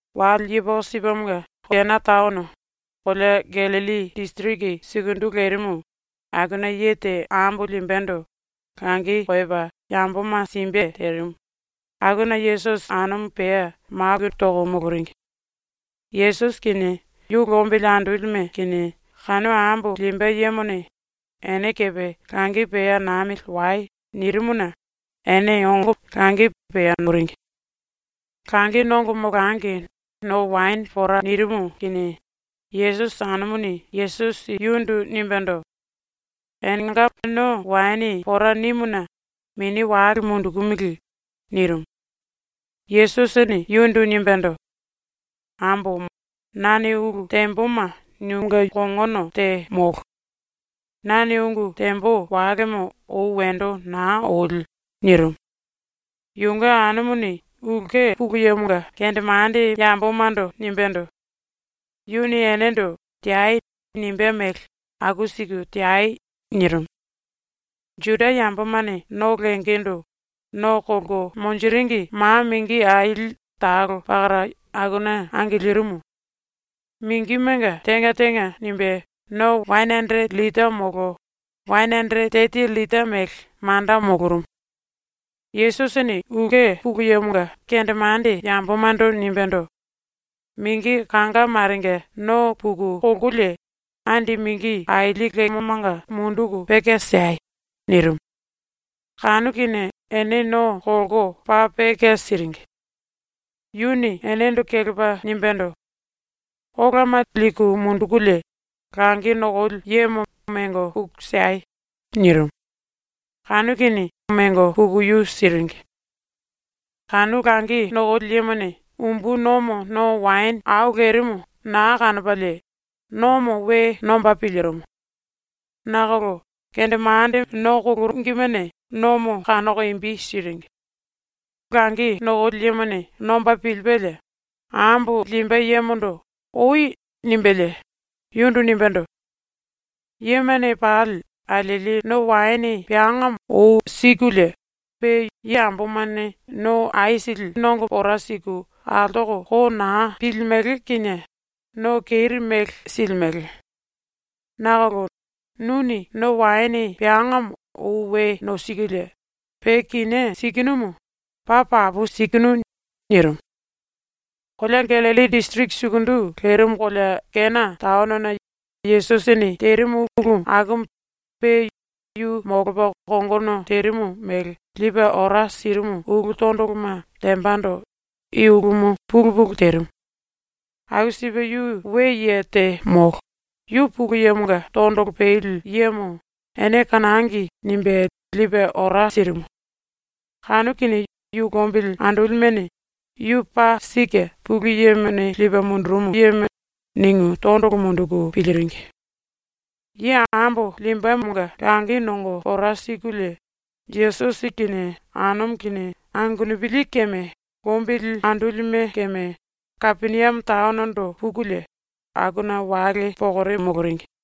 Wale yepoko sipemonga Kena taono, kolea Gallilli disiriki sukundu lerimu, akuna ye te ambo limbendo langi koyopa yamboma simbe terimu, akuna Yesusi anumu pea maku toko moloringi. Yesusi kinie yu lombili andolime kinie kanu ambo limbe yemone “Ene kepe langi pea namili wai.” nirimuna ene ongo langi pea noringi. Langi nongo molangi no waene pora nirimu kinie Yesusi anumuni Yesusi yundu nimbendo: “Enenga no waene pora nimuna mini wale mundukumili.” nirimu. Yesusini yundu nimbendo: “Ambomo, nane ulu temboma nunge kongono te molo. Nane ungu tembo walemo ou wendo naa oli.” nirimu. Yunge anumuni ⸤ulke pulu yemonga⸥ kendemande yambomando nimbendo: “Yuni enendo “Teai.” nimbé mele aku siku teai.” nirimu. Juda yambomane no lengendo no kolko monjiringi ma mingi aili talo pakara akuna angilirimu. Mingimenga tenga tenga nimbe no wane anderete llita molo wane anderete teti llita mele manda molorumu. Yesusini ⸤ulke pulu yemonga⸥ kendemande yambomando nimbendo: “Mingi kanga marenga no puku kolkolie, andi mingi aili lemomanga munduku peke siei.” nirimu. Kanu kinie ene no kolko paa peke siringi. Yuni enendo kelepa nimbendo: “Olama liku mundukulie langi nokoli yemo mengo puku siei.” nirimu. Kanu kinie mengo puku yu siringi. Kanu langi nokoli yemone umbu nomo no waene au lerimu naa kanopalie nomo we nomba pilirimu. Nakolo kendemande no koloringimene nomo kanoko imbi siringi. Langi nokoli yemone nomba pilipelie ambo limbe yemondo “Oi.” nimbelie yundu nimbendo: “Yemane pali alieli no waene peangamo ou sikulie, pe yambomane no aisili nongo pora siku altoko ko naa pilimele kinie no keri mele silimele. Nakolo nuni no waene peangamo ou we nosikulie pe kinié sikinumu, ⸤paa papu sikinu⸥.” nirimu. Kolea Gallilli disiriki sukundu lerimu kolea Kena taonona Yesusini terimu ulu akumu pe yu molopa kongono terimu mele lipe ora sirimu ulu tondoloma tembando i ulumu pulu pulu terimu. Aku sipe yu we ye te molo, yu Pulu Yemonga tondolo peli yemo ‘ene kanangi.’ nimbe lipe ora sirimu. Kanu kinie yu lombili andolimene ‘Yu paa sike ⸤Pulu Yemone lipe mundurumu⸥.’ ningu tondolo munduku piliringi. Ye ambo limbemonga langi nongo pora sikulie Yesusi kinie anumu kinie angenupili keme lombili andolime keme Kapeniame taonondo pukulie, akuna wale pokore moloringi.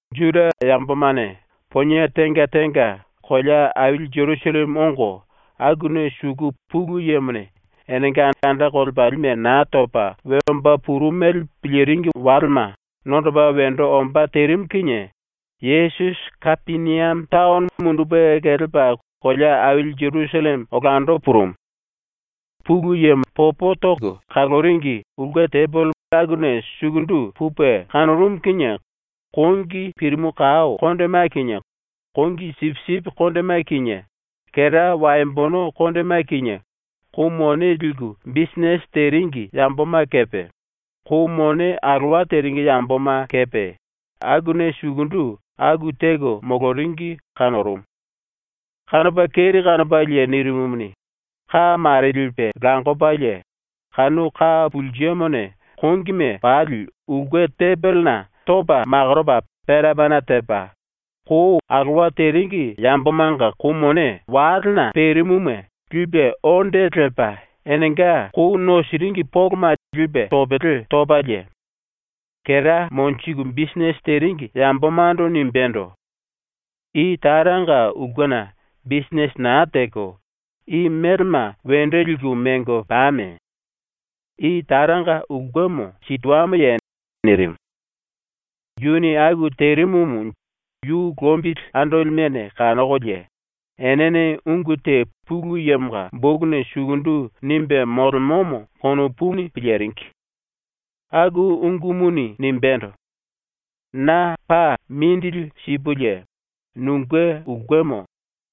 Juda yambomane ponie tenga tenga kolea aili Jerusalleme ongo akuna suku Pulu Yemone enenga anda kolepalime Naa Topa We Omba Purumu mele piliringi walema nondopa wendo ombá terimu kinie Yesusi Kapeniame taono mundupe kelepa kolea aili Jerusalleme olando purumu. ⸤Pulu Yemo popo toko kaloringi⸥ ulke tembele akuna sukundu pupe kanorumu kinie kongi pirimu kao kondema kinie kongi sipisipi kondema kinie kera waembono kondema kinie kou mone liku bisinete teringi yamboma kepe, kou mone alowa teringi yamboma kepe akuna sukundu aku teko moloringi kanorumu. Kanopa keri kanopalie nirimumuni, ka mare lipe lakopalie kanu ka pulsemone kongime pali ulke tembelena topa makoropa pena pena tepa, kou alowa teringi yambomanga kou mone walena perimuma lipe ondo lepa enenga kou nosiringi poloma lipe topele topalie, kera monjiku bisinete teringi yambomando nimbendo: “I Taranga ulkena bisinete naa teko i melema wendo liku mengo pame! I Taranga ulkemo sitoamoye?” nirimu. Yuni aku terimumu yu lombili andolimene kanokolie enene ungu te Pulu Yemonga bokuna sukundu nimbe molemomo konopuni piliringi. Aku ungumuni nimbendo: “Na paa mindili sipulie nunge ulkemo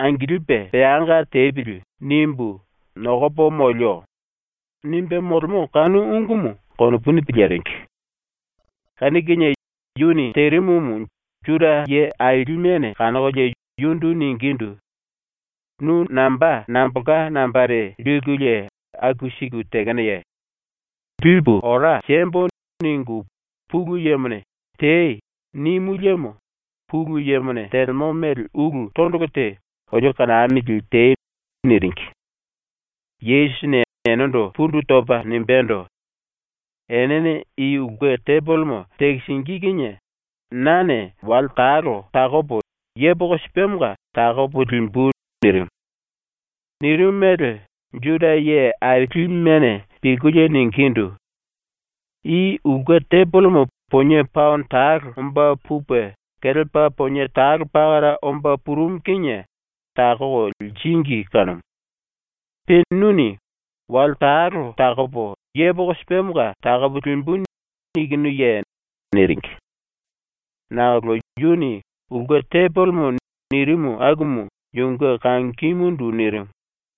‘Angilipe peanga tepili.’ nimbu nokopo molio.” nimbe molemo kanu ungumu konopuni piliringi. Kanu kinie yuni terimumu Juda ⸤ye aili⸥ mene kanokolie yundu ningindu: “Nu namba nambolka nambare likulie aku siku tekenoye? ‘Lipu ora siembo.’ ningu Pulu Yemone “Tei.” nimu liemo Pulu Yemone telemo mele ulu tondolo te olio kanamili tei.” niringi. Yesusini enendo pundu topa nimbendo: “Enene i ulke tembelemo tekisingí kinie nane wale talo takopo yepoko sipemonga takopo limbu.” nirimu. Nirimu mele Juda ⸤ye aili⸥ mene pilkulie ningindu: “I ulke tembelemo ponie paono talo omba pupe kelepa ponie talo pakara omba purumu kinie takoko liringi kanumu. Pe nuni “Wale talo takopo yepoko sipemonga takopo limbu.” nikinuye?” niringi. Nakolo yuni “ulke tembelemo” nirimu akumu yunge kangimundu nirimu.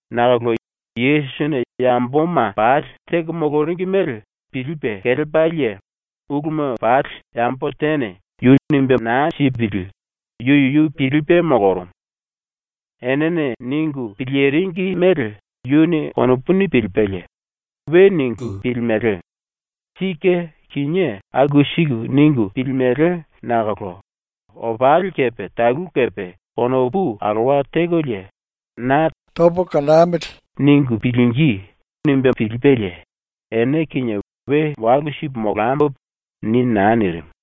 Nakolo Yesusini yamboma pali teko moloringi mele pilipe kelepalie uluma pali yambo tene yu lipe ora sipe naa nipili yu yuyu pilipe molorumu. Enene ningu piliringi mele yuni konopuni pilipelie, ⸤‘We ningu pilimele. Sike kinié aku siku ningu pilimele nakolo opali kepe talu kepe konopu alowa tekolie na ‘Tamili.’ ningu pilingí.’ nimbe pilipelie,⸥ ‘Ene kinie we walu sipu molambo.’ ni naa nirimu.